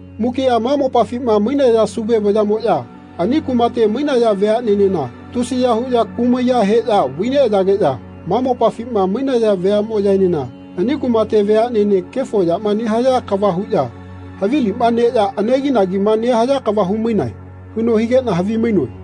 Mukiꞌa ma mopafima mainaya Sauve vayaꞌmoꞌya ani kumate mainaya veaꞌnenena tusiya huꞌya kumaiya heꞌya vai neꞌayageꞌya ma mopafima mainaya veaꞌmoꞌyaenena ani kumate veaꞌnenena kefo yama nehaya kava huꞌya havilima neꞌya anegi-nagima nehaya kava humainae.” huno higeꞌna havi-mainoe.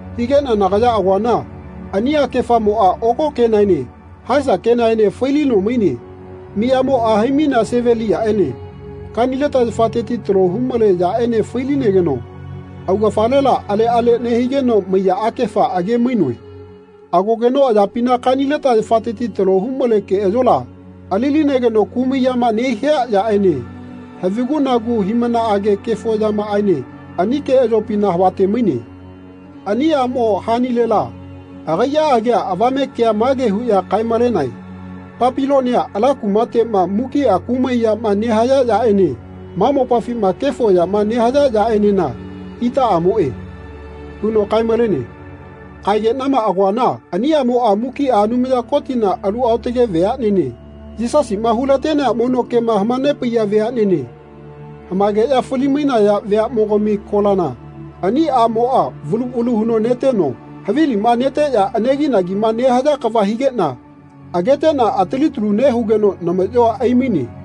Hanegeꞌna nagaya agoana ani akefamoꞌa oko kenaene haesa kenaene fai-lino maine. Miyamoꞌa hai-mainea seveliyaꞌene kanileta yafateti talo humale yaꞌene fai-linegeno augafalela aleꞌale nehigeno maiya akefa age-mainoe. Agogeno ayapina kanileta yafateti talo humale keꞌayola ali-linegeno kumai yama nehia yaꞌene havigu-nagu hiꞌmanaꞌage kefo yamaꞌaene ani keꞌayopina havate-maine. Ani aꞌmo hanilela agaiꞌa agia avame kea mage huꞌya kae-malenae “Papilonia ala kumateꞌma mukiꞌa kumai yama nehaya yaꞌene ma mopafima kefo yama nehaya yaꞌenena itaꞌamoꞌe.” huno kae-malene. Kaegeꞌnama agoana ani aꞌmoꞌa mukiꞌa Anumaya Kotina alu aotage veaꞌnene, Yisasiꞌma hulatenea mono kema hamanepaiya veaꞌnene hamaegeꞌya fali-mainaya veaꞌmogami kolana ani aꞌmoꞌa valu valu huno neteno havilima neteꞌya anegi-nagima nehaya kava higeꞌna ageteꞌna atali talu nehugeno namaꞌyoa aimaine.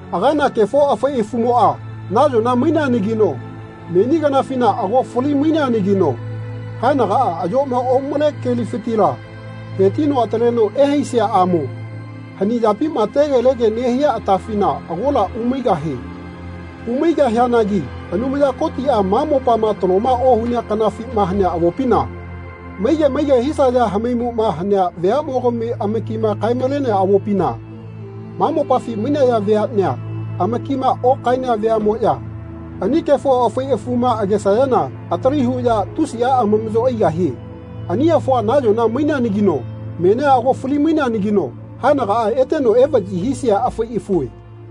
Agana kefo afai afumoꞌa nayona maineanagino meni kanafina ago fali-maineanagino haenagaꞌa ayoꞌma omale komufitila hetino ataleno ehaisiaꞌamo hani yapima tegelege nehia atafina agola umaigahie. Umaigahianagi Anumaya Kotiꞌa ma mopa taloma ohunea kanafima hanea avopina, maige maige hisaya hamaimuꞌma hanea veaꞌmogami amakima kae-malenea avopina, ma mopafi mainaya veaꞌnea amakima okaenea veaꞌmoꞌya ani kefo afai afuma agesayana atali huꞌya tusiꞌa amamaꞌyo aigahie. Ani afua nayona maineanagino menia ago fali-maineanagino haenagaꞌa eteno evaꞌyi hisia afai afue.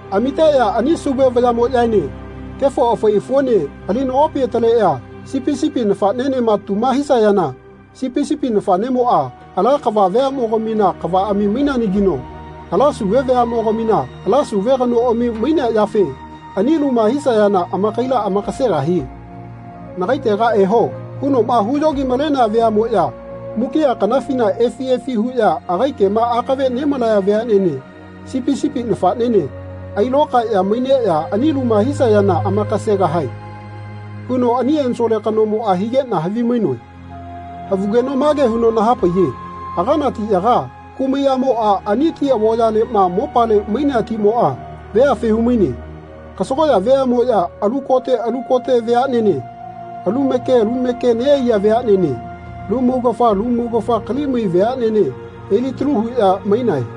Amiteꞌya ani Sauve vayaꞌmoꞌyaene kefo afai afuene ali nagopi ataleꞌya Sipi sipi nafaꞌnenema tuma hisayana Sipi sipi nafaꞌnemoꞌa, ala kava veaꞌmogamina kavaꞌami maineanagino ala Sauve veaꞌmogamina ala Sauve kanoꞌami mainea yafe ani luma hisayana amakaila amakasegahie. ‘Nagaitega eho.’ hunoꞌma huyogi-malenea veaꞌmoꞌya mukiꞌa kanafina efi efi huꞌya agai kema akave nemalaya veaꞌnene Sipi sipi nafaꞌnene ailokaeꞌya maineꞌya ani luma hisayana amakasegahae.” huno ani ensole kanomoꞌa higeꞌna havimainoe. Havugeno mage huno nahapaiye “Agana tiꞌyaga, kumai aꞌmoꞌa ani ti avoyaleꞌma mopale mainea timoꞌa, veafe humaine. Kasagoꞌya veaꞌmoꞌya alu kote alu kote veaꞌnene, alu make lu make neꞌaiya veaꞌnene, alu maugafa lu maugafa kali-mai veaꞌnene elitalu huꞌya maine.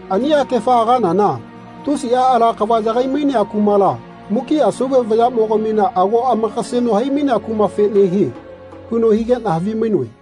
Ani akefa aganana tusiꞌa ala kava yagai-mainea kumala, mukiꞌa Sauve vayaꞌmogamina ago amakaseno hai-mainea kumafe nehie.” huno higeꞌna havimainoe.